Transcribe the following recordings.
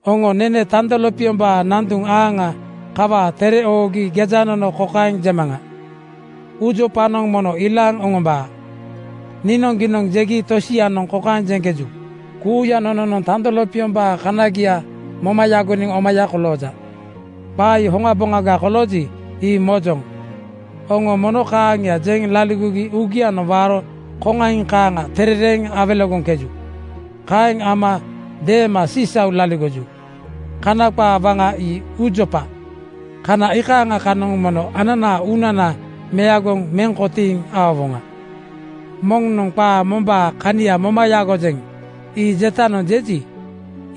Oŋo nene tando lopiombaa nanduŋ aaŋa kawaa tere oogi gejanono kokaeŋ jemaŋa: Uujopanoŋ mono ilaaŋ oŋombaa. Niinoŋgiinoŋ jegi tosianoŋ kokaeŋ jeŋkeju, “Kuuya nononoŋ tando lopiombaa kanagia moma yagoniŋ omaya kolooja.” Qaa ii hoŋaboŋaga kolooji, ii mojoŋ. Oŋo momo kaaŋia jeŋ laligogi uugianoŋ waaro koŋaiŋ kaaŋa terereeŋ awelegoŋkeju. Kaeŋ ama deema sisau laligoju. Kana qaa waŋa ii uujopa. Kana iikaaŋa kanoŋ mono ananaa uunana meagoŋ meŋ kotiiŋ aowoŋa. Moŋnoŋ “Qaa mombaa kania moma yagojeŋ,” ii jetanoŋ jeji,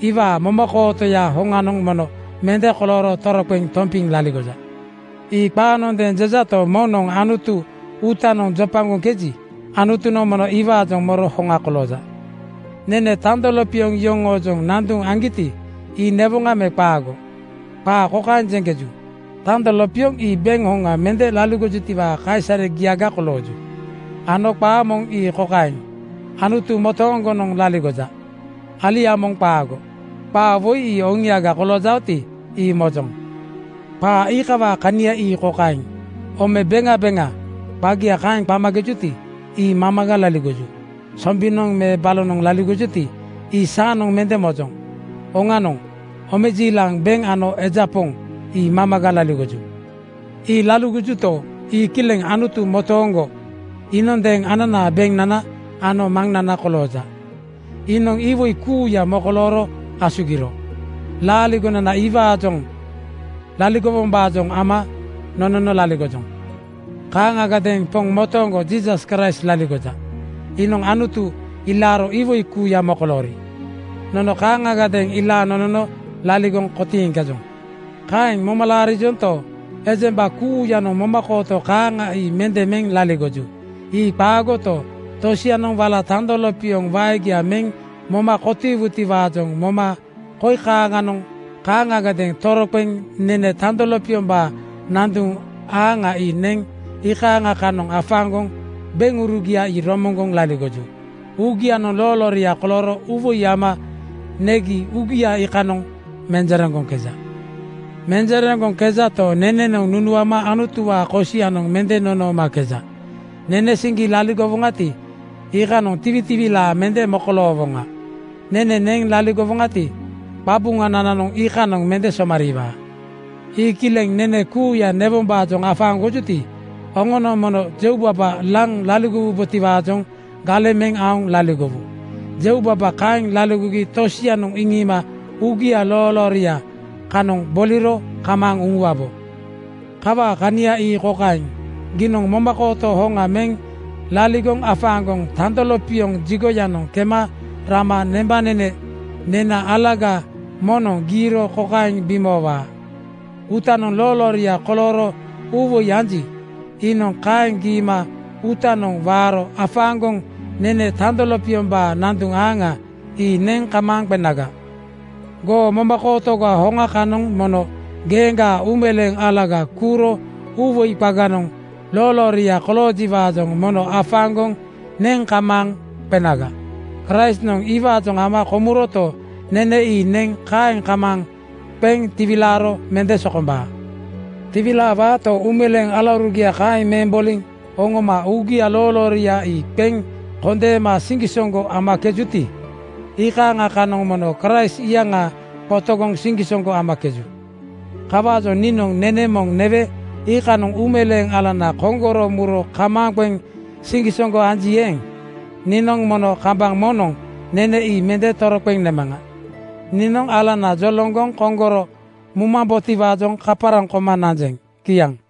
iwaa momakootoya hoŋanoŋ mono mende kolooro toroqeŋ tompiŋ laligoja. Ii qaanondeeŋ jejato, moŋnoŋ Anutu uutanoŋ jopagoŋkeji, Anutunoŋ mono iwaajoŋ moro hoŋa kolooja. Nene tando lopioŋ yoŋoojoŋ nanduŋ aŋgiti, ii newoŋa me qaago? Qaa kokaeŋ jeŋkeju, “Tando lopioŋ ii beŋ hoŋa mende laligojutiwaa kaisaregia kolooju,” ano qaa moŋ ii kokaeŋ, “Anutu motooŋgonoŋ laligoja. Alia moŋ qaago.” Qaa woi ii oŋiaga koloojaoti, ii mojoŋ. Qaa iikawaa kania ii kokaeŋ, “Ome beŋa beŋa,” qagia kaeŋ qamakejuti, ii mamaga laligoju. Sombinoŋ me balonoŋ laligojuti, ii saanoŋ mende mojoŋ. Oŋanoŋ omejiilaŋ, beŋ ano eja poŋ ii mamaga laligoju. Ii laligojuto, ii kileŋ Anutu motooŋgo iinondeeŋ ananaa beŋnana ano Maŋnana kolooja. Iinoŋ iwoi kuuya mokolooro asugiro. Laaligonana iwaajoŋ laligowombaajoŋ ama nonono laligojoŋ. Kaaŋagadeeŋ Poŋ motooŋgo Jiisas Kraist laligoja. Iinoŋ Anutu ilaaro iwoi kuuya mokoloori. Nono kaaŋagadeeŋ ilaaŋ nonono laligoŋ kotiiŋkejoŋ. Kaeŋ moma laarijonto, ejemba kuuyanoŋ momakooto kaaŋa ii mende meŋ laligoju. Ii qaagoto, tosianoŋ wala tando lopioŋ waegia meŋ moma kotiigitiwaajoŋ ama koi kaaŋanoŋ kaaŋagadeeŋ toroqeŋ nene tando lopiombaa nanduŋ aaŋa ii neŋ iikaaŋa kanoŋ afaaŋgoŋ beŋurugia ii romoŋgoŋ laligoju. Uugianoŋ loolooria kolooro uuwoi ama negi uugia iikanoŋ menjereŋgoŋkeja. Menjereŋgoŋkejato, nenenoŋ nunuama Anutuwaa kosianoŋ mende nonoomakeja. Nene siŋgi laligowoŋati, iikanoŋ tiwitiwilaa mende mokoloowoŋa. Nene neŋ laligowoŋati, qabuŋanananoŋ iikanoŋ mende somariiwaa. Ii kileŋ nene kuuya newombaajoŋ afaaŋgojuti, oŋonoŋ mono jeubaba laŋ laligowubotiwaajoŋ galeŋ meŋ aoŋ laligowu. Jeubaba kaeŋ laligogi tosianoŋ iŋiima uugia loolooria kanoŋ boliro kamaaŋ uŋuwabo. Kawaa kania ii kokaeŋ: Giinoŋ momakooto hoŋa meŋ laligoŋ afaaŋgoŋ tando lopioŋ jigoyanoŋ kema rama nembanene nena alaga moŋnoŋ giiro kokaeŋ bimoowaa: Uutanoŋ loolooria kolooro uuwoi anji, iinoŋ kaeŋ giima uutanoŋ waaro afaaŋgoŋ nene tando lopiombaa nanduŋ aaŋa ii neŋ kamaaŋ qenaga. Goo momakootoga hoŋa kanoŋ mono geeŋgaa uumeleeŋ alaga kuuro uuwoi qaganoŋ loolooria koloojiwaajoŋ mono afaaŋgoŋ neŋ kamaaŋ qenaga. Kraistnoŋ iwaajoŋ ama komuroto, nene ii neŋ kaeŋ kamaaŋ qeŋ tiwilaaro mende sokombaa. Tiwilaawaato, uumeleeŋ alaurugia kaeŋ meŋ boliŋ oŋoma uugia loolooria ii qeŋ kondeema siŋgisoŋgo amakejuti, iikaaŋa kanoŋ mono Kraist iyaŋa qotogoŋ siŋgisoŋgo amakeju. Kawaajoŋ niinoŋ nene moŋ newe iikanoŋ uumeleeŋ alana koŋgoro muro kamaaŋ qeŋ siŋgisoŋgo anji eeŋ, niinoŋ mono kambaŋ moŋnoŋ nene ii mende toroqeŋ nemaŋa. Niinoŋ alana joloŋgoŋ koŋgoro mumambotiwaajoŋ kaparaŋ koma nanjeŋ. Kiaŋ.